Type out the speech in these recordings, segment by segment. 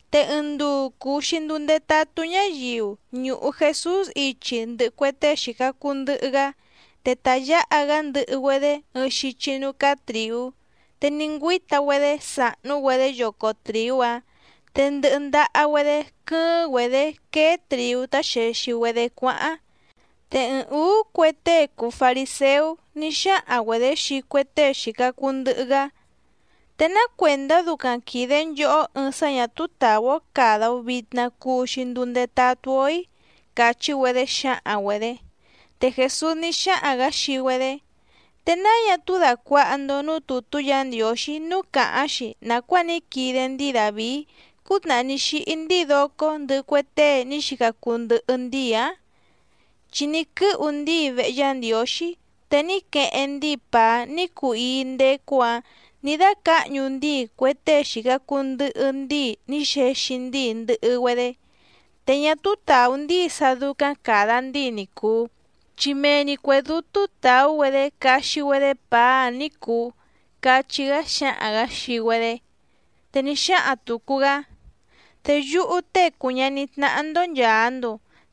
Te ɨɨⁿ nduu cùu‑xi nduu ndetatú ñáyiu ñùhu Jesús ichi ndɨhɨ cue tée xìca cuu ndɨhɨ‑gá, te ta yǎha‑gá ndɨhɨ‑güedé ɨɨⁿ xichi núú cáá trìú, te ní ngüíta‑güedé sàhnú‑güedé yoco trìú‑áⁿ te ndɨhɨ ndaha‑güedé quɨ́ɨ́ⁿ‑güedě quéé trìú tá xèxi‑güedé cuáháⁿ. Te ɨɨⁿ ǔú cue tée cùu fariséú ní xáhaⁿ‑güedě xii cue tée xìca cuu ndɨhɨ‑gá: —¿Te ná cuèndá ducaⁿ quìde nchohó ɨɨⁿ sá ñà túú tàú‑ó càda‑o vitna cuu‑xi nduu ndetatú‑ó‑í? —càchí‑güedé xǎhaⁿ‑güedě. Te Jèsús ní xáhaⁿ‑gǎ xii‑güedé: —¿Te náa ñá túú dàcuaha‑ndo núú tùtú Yǎ Ndiǒxí núú càháⁿ‑xi nàcuáa ní quide ndíi Dàvií cútnàhá ní xíhí ndíi docó ndɨhɨ cue tée ní xica cuu ndɨhɨ ndíi‑ǎⁿ? Chi ní quɨ́hu ndíi vehe Yá Ndiǒxí, te ní queheⁿ ndíi pàá ní cuu íí ndécú‑ǎⁿ nǐ dácǎhñu ndíi cue tée xìca cuu ndɨhɨ ndíi ní xexi ndíi ndɨhɨ‑güedé, te ñá túú tàú ndíi sá dúcáⁿ càda ndíi ni cùu, chi mee‑ni cuè dútú tàú‑güedé caxi‑güedé pàá‑áⁿ ní cùu —cachí‑gá xǎhaⁿ‑gǎ xii‑güedé. Te ní xáhaⁿ tùcu‑gá: —Te yúhú Tée cùu ñaní tnáhá‑ndó nchàa‑ndo,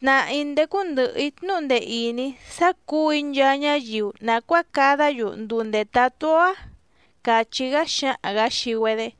tnàhá‑í ndécú ndɨ̀hɨ‑í tnúhu ndee ìní sá cǔu‑í nchaa ñáyiu nàcuáa cadá‑yu nduu ndètatú‑ó‑á —càchí‑gá xǎhaⁿ‑gǎ xii‑güedé.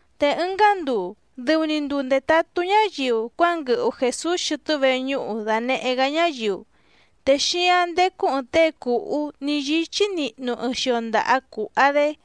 Te ɨngá nduu dɨu‑ni nduu ndètatú ñáyiu cuánguɨhu Jèsús xɨtɨ́ veñúhu dànehé‑gá ñáyiu. Te xíáⁿ ndécú ɨ̀ɨⁿ tée cùhú ní yíchí nihnu ɨɨⁿ xio ndaha cùha‑dé.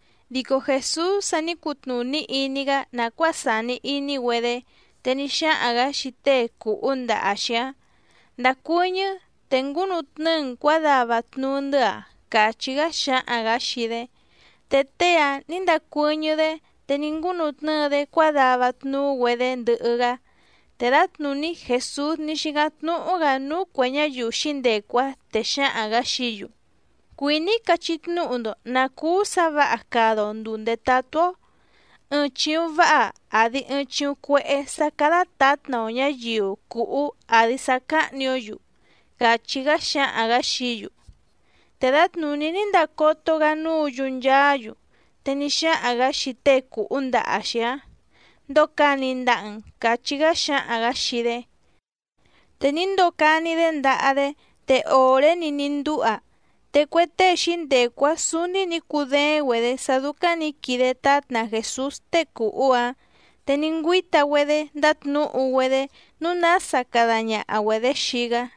Dico Jèsús sa ní cutnùní iní‑gá nàcuáa sàni iní‑güedé, te ní xáhaⁿ‑gǎ xii tée cùhú ndaha‑xi‑áⁿ: —Ndàcuɨñɨ́ te ngúnutnɨ́ɨ‑n cuǎdava tnuú‑ndɨ́‑a —càchí‑gá xǎhaⁿ‑gǎ xii‑dé. Te tée‑áⁿ nǐ ndacuɨ́ñɨ́‑dé te ní ngúnutnɨ́ɨ‑dé cuádava tnuú‑güedé ndɨhɨ‑gá. Te dǎtnùní Jèsús ní xícáⁿ tnúhú‑gǎ núú cuè ñáyiu xǐndecu‑áⁿ, te xǎhaⁿ‑gǎ xií‑yu: —Cuìní‑í cachí tnúhu‑ndo nǎ cúú sǎ vǎha cada‑o ndùu ndetatú‑ó. ¿Ɨɨⁿ chìuⁿ váha àdi ɨɨⁿ chiuⁿ cuehé, sá cádá tǎtna‑o ñǎyiu cùhú àdi sá cáhnì‑ó‑yu? —càchí‑gá xǎhaⁿ‑gǎ xií‑yu. Te dǎtnùní ní ndacoto‑gá núǔ‑yu nchaá‑yu, te ní xáhaⁿ‑gǎ xii tée cùhú ndaha‑xi‑áⁿ: —Ndocani ndaha‑n —càchí‑gá xǎhaⁿ‑gǎ xii‑dé. Te ní ndocani‑dé ndaha‑dé, te òré‑ni ní ndúha. Te cue tée xǐndecu‑áⁿ sǔúní nǐ cudééⁿ‑güedě sá dúcáⁿ nǐ quide tátna Jèsús tée cùhú‑áⁿ, te ní ngüíta‑güedé ndátnǔhu‑güedé nǔu nása cada ñaha‑güedě xii‑gá.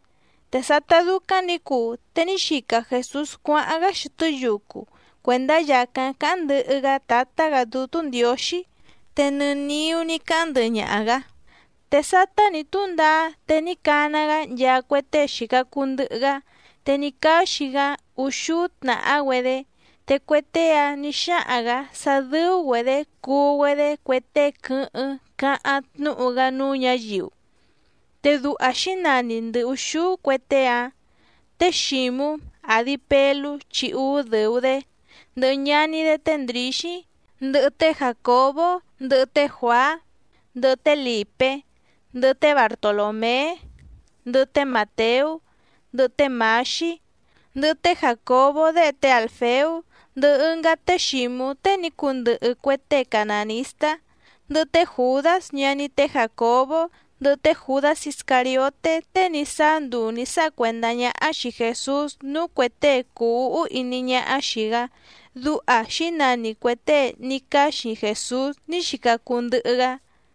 Te sátá dúcáⁿ nǐ cuu te ní xica Jèsús cuáháⁿ‑gá xɨtɨ́ yucu cuèndá yàcáⁿ cáháⁿ ndɨhɨ‑gá Tǎtá‑gǎ Dútú Ndiǒxí, te nɨ niú ní cáháⁿ ndɨhɨ ñaha‑gǎ. Te sátá nǐ túndaá, te ní cana‑gá nchaa cue tée xìca cuu ndɨhɨ‑gá, te ní cáxi‑gá úxúú tnàhá‑güedé, te cue tée‑áⁿ nǐ xáhaⁿ‑gǎ sá dɨ́ú‑güedě cuu‑güedé cue tée quɨ́hɨ́ⁿ cáháⁿ tnúhu‑gá núú ñǎyiu. Te duha xǐnani ndɨ ùxúú cue tée‑áⁿ. Té Xǐmú, àdi Pelú chi úú dɨ̀u‑dé, ndɨhɨ ñaní‑dé té Ndrǐxí, ndɨhɨ té Jàcobó, ndɨhɨ té Juàá, ndɨhɨ té Lìpé, ndɨhɨ té Bartolòmé, ndɨhɨ té Màteú, ndɨhɨ té Mǎxí, ndɨhɨ té Jàcobó déhe té Àlfeú, ndɨhɨ ɨngá té Xǐmú tée ní cundɨhɨ cue tée canànistá, ndɨhɨ té Jùdás ñaní té Jàcobó, ndɨhɨ té Jùdás Iscàrioté tée ní sáá nduu nǐ sáha cuèndá ñáhá xìi Jesús núú cuè tée cùu úhú iní ñáhá xìi‑gá, duha xǐnani cuè tée ní cáxi Jèsús ní xica cuu ndɨhɨ‑gá.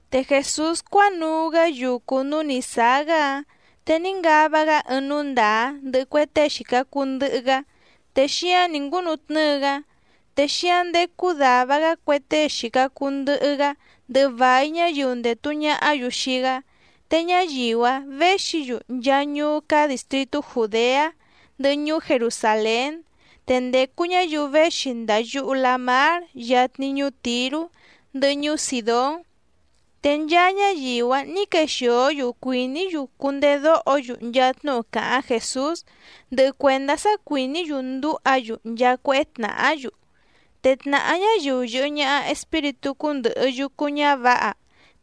Te Jèsús cuánuu‑gá yucu núú nǐ sáá‑gá‑áⁿ, te ní ngava‑gá ɨɨⁿ núú ndàá ndɨhɨ cue tée xìca cuu ndɨhɨ‑gá, te xíáⁿ nǐ ngúnutnɨ́ɨ‑gá. Te xíáⁿ ndécú dàva‑gá cue tée xìca cuu ndɨhɨ‑gá ndɨhɨ vài ñáyiu ndètu ñahá‑yu xii‑gá, te ñáyiu‑áⁿ věxi‑yu nchaa ñuú cáá dìstritú Jùdeá, ndɨhɨ ñuú Jerusàlén, te ndècu ñáyiu véxi ndàa yuhu lamár yatni ñuú Tìrú, ndɨhɨ ñuú Sìdón. Te nchaa ñáyiu‑áⁿ nǐ quexìó‑yu cuìní‑yu cundedóho‑yu nchaa tnúhu càháⁿ Jèsús, ndɨhɨ cuèndá sá cuìní‑yu ndúha‑yu nchaa cuéhé tnàhá‑yu. Te tnàhá ñáyiu yɨ̀hɨ ñaha espíritú cúndɨ̀hɨ yucu ñávǎha.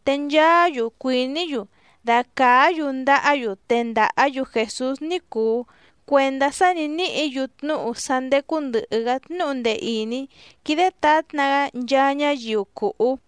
Te nchaá‑yu cuìní‑yu dacàá‑yu ndahá‑yu tendàhá‑yu Jèsús ní cùu cuendá sá nǐ níhǐ‑yu tnúhu sá ndècu ndɨhɨ‑gá tnúhu ndee ìní quídé tǎtna‑gá nchaa ñáyiu cùhú.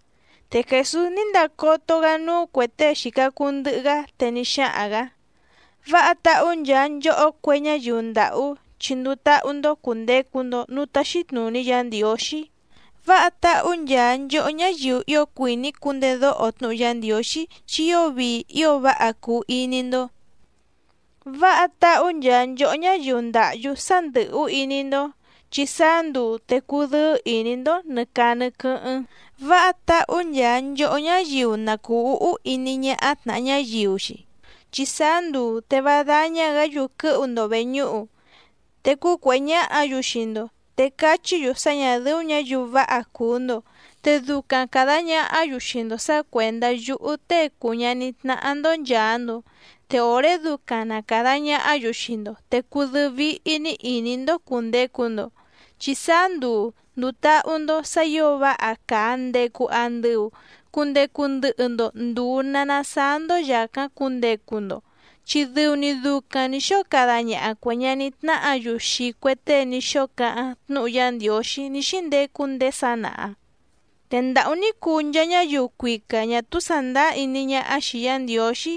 Te Jèsús ní ndacoto‑gá núú cuè tée xìca cuu ndɨhɨ‑gá, te ní xáhaⁿ‑gǎ: —Váha táhú nchaa nchòhó cue ñáyiu ndàhú, chi nduu táhú‑ndó cùndecu‑ndo núú táxí tnùní Yǎ Ndiǒxí. ’Váha táhú nchaa nchòhó ñáyiu ío cuìní cundedóho tnúhu Yá Ndiǒxí chi ío vii ío váha cuu iní‑ndó. ’Váha táhú nchaa nchòhó ñáyiu ndàhyú sá ndɨ̀hú iní‑ndó, chi sáá nduu te cudɨ́ɨ́ ìní‑ndó nɨ̀ caa nɨ quɨ́hɨ́ⁿ. ’Váha táhú nchaa nchòhó ñáyiu na cùu úhú iní ñáhá tnàha ñáyiu‑xi, chi sáá nduu te vá dáñá‑gǎ‑yu quɨ́hu‑ndo vèñúhu, te cúcuèhé ñáhǎ‑yu xii‑ndo, te cachí‑yu sá ñà dɨ́ú ñǎyiu váha cùu‑ndo, te ducaⁿ càda ñahá‑yu xii‑ndo sǎ cuèndá yúhú Tée cùu ñaní tnáhá‑ndó nchàa‑ndo. Te òré ducaⁿ na càda ñahá‑yu xii‑ndo te cudɨ́ɨ́ víhí‑ní ìní‑ndó cùndecu‑ndo, chi sáá nduu ndùu táhú‑ndó sǎ ǐo váha càa ndecu andɨu cundecu ndɨhɨ‑ndo nduu na nasaá‑ndó yàcáⁿ cundecu‑ndo, chi dɨu‑ni ducaⁿ nǐ xóo cada ñaha cuè ñaní tnáhǎ‑yu xii cue tée ní xóo cáháⁿ tnúhu Yá Ndiǒxí ní xíndecu ndéé sanaha. ’Te ndàhú ní cuu nchaa ñáyiu cuica ñà túú sàndáá iní ñáhá xìi Yá Ndiǒxí,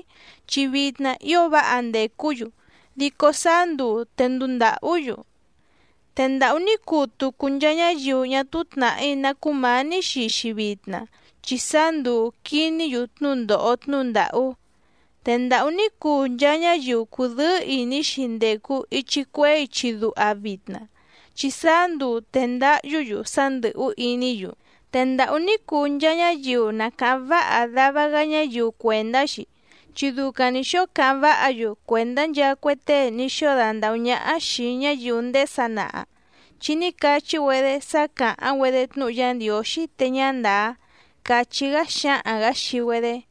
chi vitna ío váha ndècú‑yu, dico sáá nduu te nduu ndàhú‑yu. ’Te ndàhú ní cuu tucu nchaa ñáyiu ñá túú tnàhí ná cúmǎní xii‑xi vitna, chi sáá nduu quìní‑yu tnúndòho tnúhu ndàhú. ’Te ndàhú ní cuu nchaa ñáyiu cùdɨ́ɨ́ ìní‑xi ndècu ichi cuehé ichi duha vitna, chi sáá nduu te ndáhyú‑yu sá ndɨ̀hú iní‑yu. ’Te ndàhú ní cuu nchaa ñáyiu na càháⁿ váha dava‑gá ñáyiu cuèndá‑xi, chi ducaⁿ nǐ xóo cáháⁿ váha‑yu cuèndá nchaa cue tée ní xóo dandàhú ñáhá xìi ñáyiu ndéé sanaha, chi ní cachí‑güedé sá càháⁿ‑güedé tnúhu Yá Ndiǒxí te ñá ndàá —càchí‑gá xǎhaⁿ‑gǎ xii‑güedé.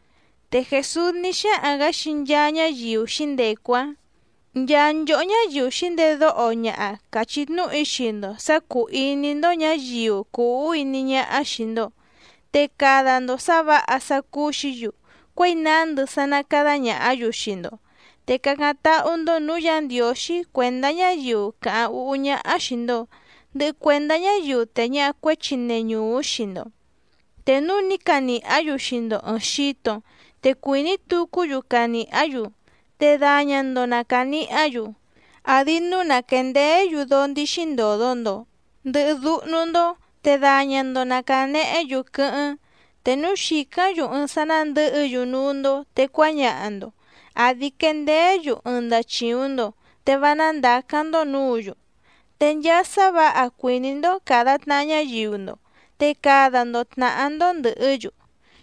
Te Jèsús ní xáhaⁿ‑gǎ xii nchaa ñáyiu xǐndecu‑áⁿ: —Nchaa nchòhó ñáyiu xǐndedóho ñaha càchí tnúhu‑í xii‑ndo sǎ cúú ìní‑ndó ñǎyiu cùu úhú iní ñáhá xìi‑ndo, te cada‑ndo sǎ vǎha sá cúú‑xǐ‑yu cuěi nándɨ sá ná cádá ñàhá‑yu xii‑ndo. Te cácáⁿ táhú‑ndó nǔú Yǎ Ndiǒxí cuèndá ñáyiu càháⁿ úhú ñáhá xìi‑ndo, ndɨhɨ cuèndá ñáyiu tèe ñaha cuéchi neñùú xii‑ndo. Te núu ní canìhá‑yu xii‑ndo ɨ̀ɨⁿ xito te cuìní tucú‑yu canìhá‑yu, te daña‑ndo na cànihá‑yu, àdi núu na quèndeé‑yu dóó ndíxí ndòdo‑ndo, ndɨhɨ dúhnú‑ndó, te daña‑ndo na cànehé‑yu quɨ́hɨ́ⁿ. Te núu xìcáⁿ‑yu ɨɨⁿ sá nándɨ̌hɨ‑yu núú‑ndó te cuáñaha‑ndo, àdi quendeé‑yu ɨɨⁿ ndachìuⁿ‑ndo, te vá nándàcáⁿ‑ndó nǔǔ‑yu. Te nchaa sá vǎha cuìní‑ndó càda tnaha ñáyiu‑ndo, te cada‑ndo tnàhá‑ndó ndɨ̀hɨ́‑yu.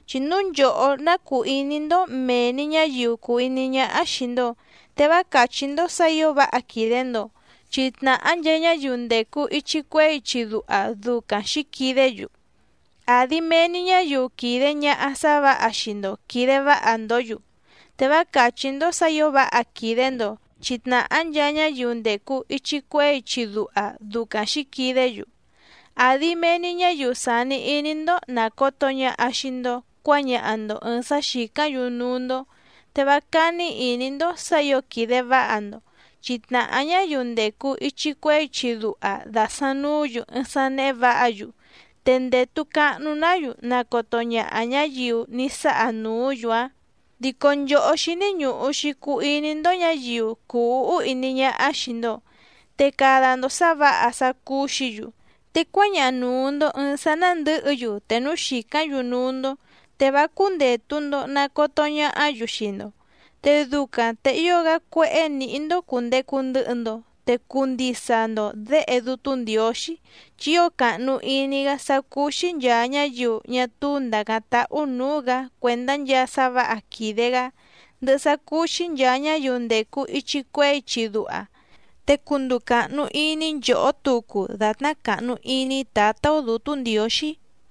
’Chi núu nchòhó ná cùu iní‑ndó mèe‑ni ñáyiu cùu iní ñáhá xìi‑ndo, te vá càchí‑ndó sǎ ǐo váha quìde‑ndo, chi tnàhá nchaa ñáyiu ndècu ichi cuehé ichi duha ducaⁿ xǐquidé‑yu. Àdi mee‑ni ñáyiu quìde ñaha sá vǎha xii‑ndo quìde váha‑ndǒ‑yu, te vá càchí‑ndó sǎ ǐo váha quìde‑ndo, chi tnàhá nchaa ñáyiu ndècu ichi cuehé ichi duha ducaⁿ xǐquidé‑yu. Àdi mee‑ni ñáyiu sàni iní‑ndó nàcoto ñaha xii‑ndo cuáñaha‑ndo ɨ̀ɨⁿ sá xìcáⁿ‑yu núú‑ndó, te vá cání ìní‑ndó sǎ ǐo quìde váha‑ndo, chi tnàhá ñáyiu ndècu ichi cuehé ichi duha dàsaⁿ nuú‑yu ɨɨⁿ sá néhé vǎha‑yu, te ndètu cahnu‑ná‑yu nacoto ñaha ñáyiu ní sáha nùú‑yu‑áⁿ. Dico nchòhó xíní ñùhu‑xi cuu iní‑ndó ñǎyiu cùu úhú iní ñáhá xìi‑ndo, te cada‑ndo sǎ vǎha sá cúú‑xǐ‑yu, te cuáñaha nùu‑ndo ɨɨⁿ sá ná ndɨ̌hɨ‑yu te núu xìcáⁿ‑yu núú‑ndó, te vá cúndètu‑ndo nacoto ñahá‑yu xii‑ndo. Te ducaⁿ te ío‑gá cuéhé nǐhí‑ndó cùndecu ndɨhɨ‑ndo, te cuu ndisa‑ndo děhe Dútú Ndiǒxí, chi ío càhnu iní‑gá sá cúú‑xí nchàa ñáyiu ñá túú ndàcáⁿ táhú nǔú‑gǎ cuèndá nchaa sá vǎha quìde‑gá, ndɨhɨ sá cúú‑xí nchàa ñáyiu ndècu ichi cuehé ichi duha. Te cunduu càhnu iní nchòhó tucu dàtná càhnu iní Tǎtá‑ó Dǔtú Ndiǒxí.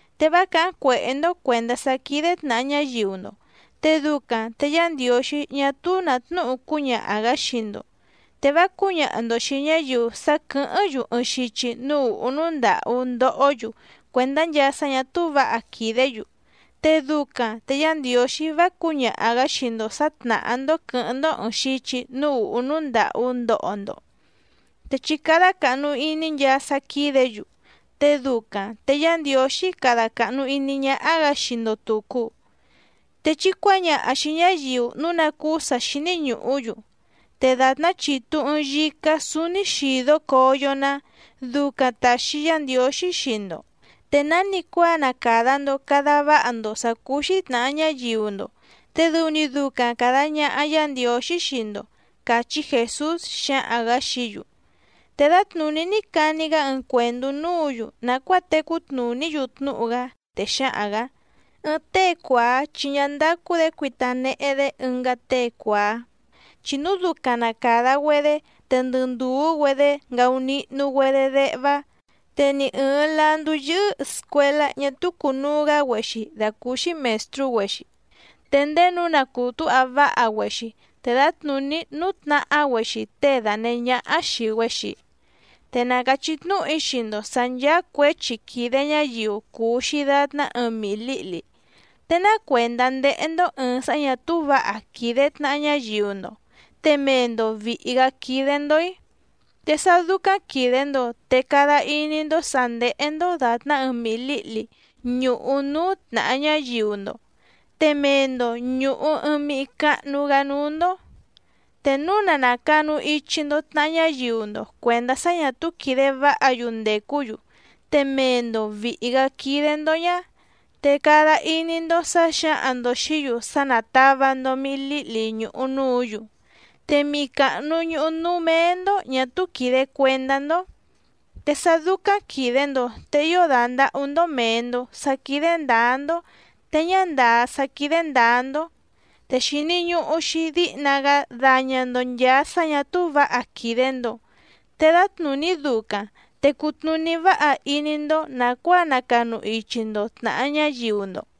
’Te vá càháⁿ cuèhé‑ndó cuèndá sá quídé tnàha ñáyiu‑ndo, te ducaⁿ te Yá Ndiǒxí ñá túú nà tnúhu cúñaha‑gǎ xii‑ndo. Te vá cǔñaha‑ndo xìi ñáyiu sá quɨ̀hɨ́ⁿ‑yu ɨɨⁿ xichi núú ùhú núú ndàhú ndohó‑yu cuèndá nchaa sá ñà túú vǎha quìdé‑yu, te ducaⁿ te Yá Ndiǒxí vá cǔñaha‑gǎ xii‑ndo sǎ tnàhá‑ndó quɨ̌hɨ́ⁿ‑ndó ɨ̀ɨⁿ xichi núú ùhú núú ndàhú ndoho‑ndo. Te chí cádá càhnu iní nchaa sá quídě‑yu, te ducaⁿ te Yá Ndiǒxí cada càhnu iní ñáhá‑gǎ xii‑ndo tùcu. Te chí cuǎñaha xìi ñáyiu núu ná cúú sǎ xíní ñùhú‑yu, te dàtná chitu ɨ̀ɨⁿ yicá súúní xìdó coyo‑ná, ducaⁿ tàxi Yá Ndiǒxí xii‑ndo. Te nánicuáa na càda‑ndo cada váha‑ndo sǎ cúú‑xí tnàha ñáyiu‑ndo, te dɨu‑ni ducaⁿ càda ñaha Yá Ndiǒxí xii‑ndo —càchí Jèsús xǎhaⁿ‑gǎ xií‑yu. Te dǎtnùní ní cani‑gá ɨɨⁿ cuèndú núǔ‑yu nàcuáa tecú tnùní‑yu tnúhu‑gá, te xǎhaⁿ‑gǎ: —Ɨɨⁿ tée cuàá chi ñá ndácú‑dě cuita nehe‑dé ɨngá tée cuàá, chi núu ducaⁿ na càda‑güedé te ndɨ ndùú‑güedé ngaunihnu‑güedé déhvá. Te ni ɨ̀ɨⁿ landú yɨ́hɨ́ scuèlá ñá túú cùnuu‑gá‑güexi dàcúúxí mèstrú‑güexi, te ndéé nǔu na cùtúha váha‑güexi, te dǎtnùní nútnahá‑güexi tée dànehé ñáhá xìi‑güexi. ’Te na càchí tnúhu‑í xii‑ndo sǎ nchàa cuéchi quìde ñáyiu cùu‑xi datná ɨɨⁿ mihi lǐhli. ¿Te ná cuèndá ndéhé‑ndó ɨ̀ɨⁿ sá ñà túú vǎha quìde tnaha ñáyiu‑ndo, te mee‑ndo vìhi‑gá quídé‑ndó‑í? Te sá dúcáⁿ quìde‑ndo te cada iní‑ndó sǎ ndéhé‑ndó dàtná ɨɨⁿ mihi lǐhli ñùhu núú tnàha ñáyiu‑ndo, te mee‑ndo ñùhu ɨɨⁿ mihi cahnu‑gá núú‑ndó. Te núu na nàcanu ichi‑ndo tnaha ñáyiu‑ndo cuèndá sá ñà túú quìde váha‑yu ndècú‑yu te mee‑ndo vìhi‑gá quídé‑ndó ñá, te cada iní‑ndó sǎ xǎhaⁿ‑ndo xìí‑yu sá nátàva‑ndo mihi líhli ñùhu núǔ‑yu, te mihi càhnu ñuhu núú méé‑ndó ñà túú quìde cuendá‑ndó. ¡Te sá dúcáⁿ quìde‑ndo te ío dàndahú‑ndó mèe‑ndo sá quídé ndǎá‑ndó te ñá ndàá sá quídé ndǎá‑ndó! Te xìni ñuhu‑xi díhna‑gá daña‑ndo nchàa sá ñà túú vǎha quìde‑ndo, te dǎtnùní ducaⁿ te cutnùní váha iní‑ndó nàcuáa nacanu ichi‑ndo tnàha ñáyiu‑ndo.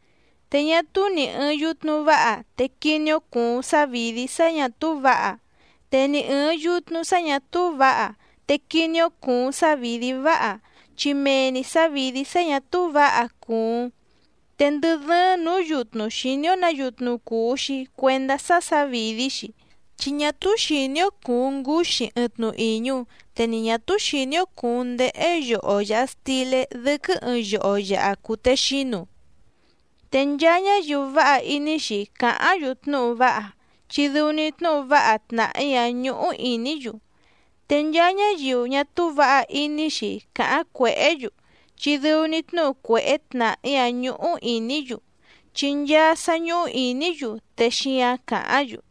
’Te ñá túú nì ɨɨⁿ yutnu váha te quiní‑ó cùuⁿ sávìdí sá ñà túú vǎha, te ni ɨ̀ɨⁿ yutnu sá ñà túú vǎha, te quiní‑ó cùuⁿ sávìdí váha, chi mee‑ni sǎvìdí sá ñà túú vǎha cùuⁿ. Te ndɨ dɨ́ɨ́ⁿ nǔú yutnu xìní‑ó nǎ yutnu cùu‑xi cuendá sá sǎvìdí‑xi, chi ñá túú xìní‑ó cùuⁿ ngúxí ɨɨⁿ tnu ìñu, te ni ñà túú xìní‑ó cùuⁿ ndéhé yoho yàha stilé dɨ́quɨ́ ɨɨⁿ yoho yàha cutexínu. Te nchaa ñáyiu váha iní‑xi càháⁿ‑yu tnúhu váha, chi dɨu‑ni tnúhu váha tnàhí‑áⁿ ñúhú ìní‑yu, te nchaa ñáyiu ñá túú vǎha iní‑xi càháⁿ cuèhé‑yu, chi dɨu‑ni tnúhu cuèhé tnàhí‑áⁿ ñúhú ìní‑yu, chi nchaa sá ñúhú ìní‑yu te xíǎⁿ càháⁿ‑yu.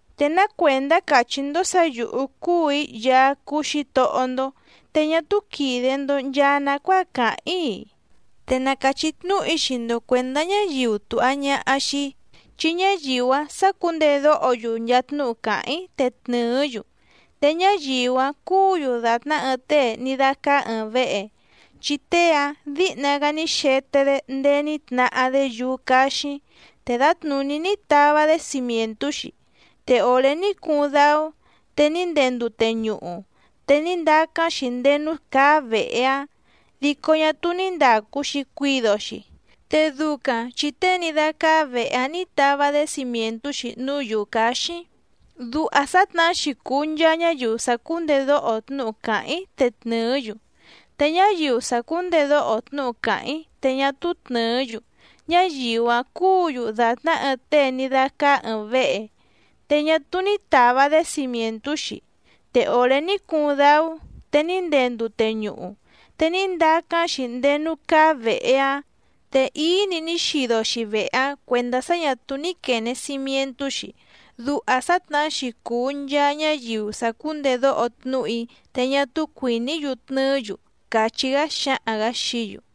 ’¿Te ná cuèndá càchí‑ndó sǎ yǔhú cúù‑í Yaá cúú Xǐtohó‑ndó te ñá túú quìde‑ndo nchaa nacuáa càháⁿ‑í‑i? Te na càchí tnúhu‑í xii‑ndo cuèndá ñáyiu tùha ñaha xii‑í, chi ñáyiu‑áⁿ sácǔndedóho‑yu nchaa tnúhu càháⁿ‑í te tnɨ̀ɨ́‑yu. Te ñáyiu‑áⁿ cúǔ‑yu dàtná ɨɨⁿ tée ní dácáá ɨ̀ɨⁿ vehe, chi tée‑áⁿ dǐhna‑gá ní xete‑dé ndéé ní tnahá‑dé yúú cáxíⁿ te dǎtnùní ní tava‑dé cimièntú‑xi, te òré ní cuuⁿ dáú, te ní ndee ndute ñuhu, te ní ndacáⁿ‑xi ndéé núú cáá vèhe‑áⁿ, dico ñá túú ní ndàcu‑xi cuido‑xi, te ducaⁿ chi tée ní dácáá vèhe‑áⁿ nǐ tava‑dé cimièntú‑xi núú yǔú cáxíⁿ. Duha sǎtnahá‑xi cùu nchaa ñáyiu sàcúndedóho tnúhu càháⁿ‑í te tnɨ̀ɨ́‑yu. Te ñáyiu sàcúndedóho tnúhu càháⁿ‑í te ñá túú tnɨ̀ɨ́‑yu, ñáyiu‑áⁿ cúǔ‑yu dàtná ɨɨⁿ tée ní dácáá ɨ̀ɨⁿ vehe, te ñá túú ní tàva‑dé cimièntú‑xi, te òré ní cuuⁿ dáú, te ní ndee ndute ñuhu, te ní ndacáⁿ‑xi ndéé núú cáá vèhe‑áⁿ, te íí‑ni ní xido‑xi vehe‑áⁿ cuèndá sá ñà túú ní quène cimientú‑xi. Duha sǎtnahá‑xi cùu nchaa ñáyiu sàcúndedóho tnúhu‑í te ñá túú cuìní‑yu tnɨɨ́‑yu —càchí‑gá xǎhaⁿ‑gǎ xií‑yu.